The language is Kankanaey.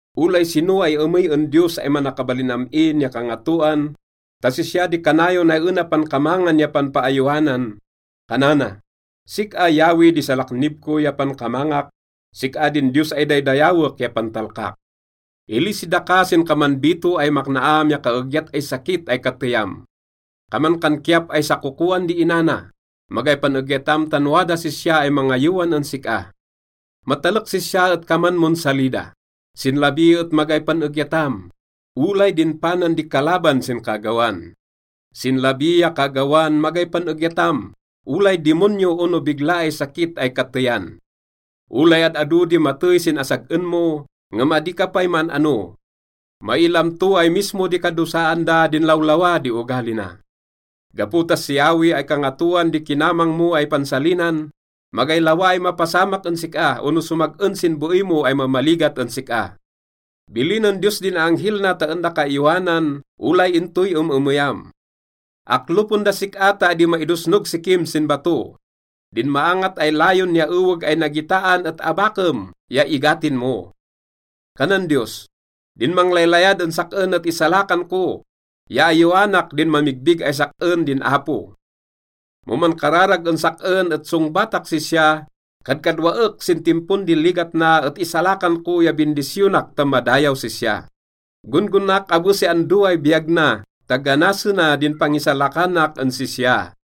Olay sino ay emey en Diyos ay Manakabalin Am-in ya Kangatoan, ta sisya di kanayon ay ena pankamangan ya panpaayowanan, kanana, “Sik-a, Yahweh, di salaknib ko ya pankamangak, sik-a din Diyos ay daydayawek ya pantalkak.” Ilisi daka sin kaman bito ay maknaam ya kaeegyat ay sakit ay kateyam. Kaman kan kiyap ay sakokoan di ina na. Magay pan-egyatam tan wadas sisya ay mangayowan en sik-a. Matalek sisya et kaman mon salida. Sin labi et magay pan-egyatam, olay din panan di kalaban sin kaagawan. Sin labi ya kaagawan, magay pan-egyatam, olay dimonyo ono bigla ay sakit ay kateyan. Olay ad-ado di matey sin asag-en mo, ngem adi ka pay maan-ano. Mailam to ay mismo di kadosaan da din lawlawa di ogali na. Gapo ta si Yahweh ay Kangatoan di kinamang mo ay pansalinan, magay lawa ay mapasamak en sik-a ono somag-en sin beey mo ay mamaligat en sik-a. Bilinen Diyos din aanghel na ta en daka ayowanan, olay intoy em-emeyam. Aklopen das sik-a ta adi maidosnog sikim sin bato. Din maangat ay layon ya eweg ay nagitaan et abakem ya igatin mo. Kanan Diyos, “Din manglaylayad en sak-en et isalakan ko, ya ayowanak din mamigbig ay sak-en din Apo. Mo mankararag en sak-en et songbatak sisya, kadkadwaek sin timpon di ligat na et isalakan ko ya bindisyonak ta madayaw sisya. Gon-gonaak abe si ando ay biyag na ta ganasena din pangisalakanak en sisya.”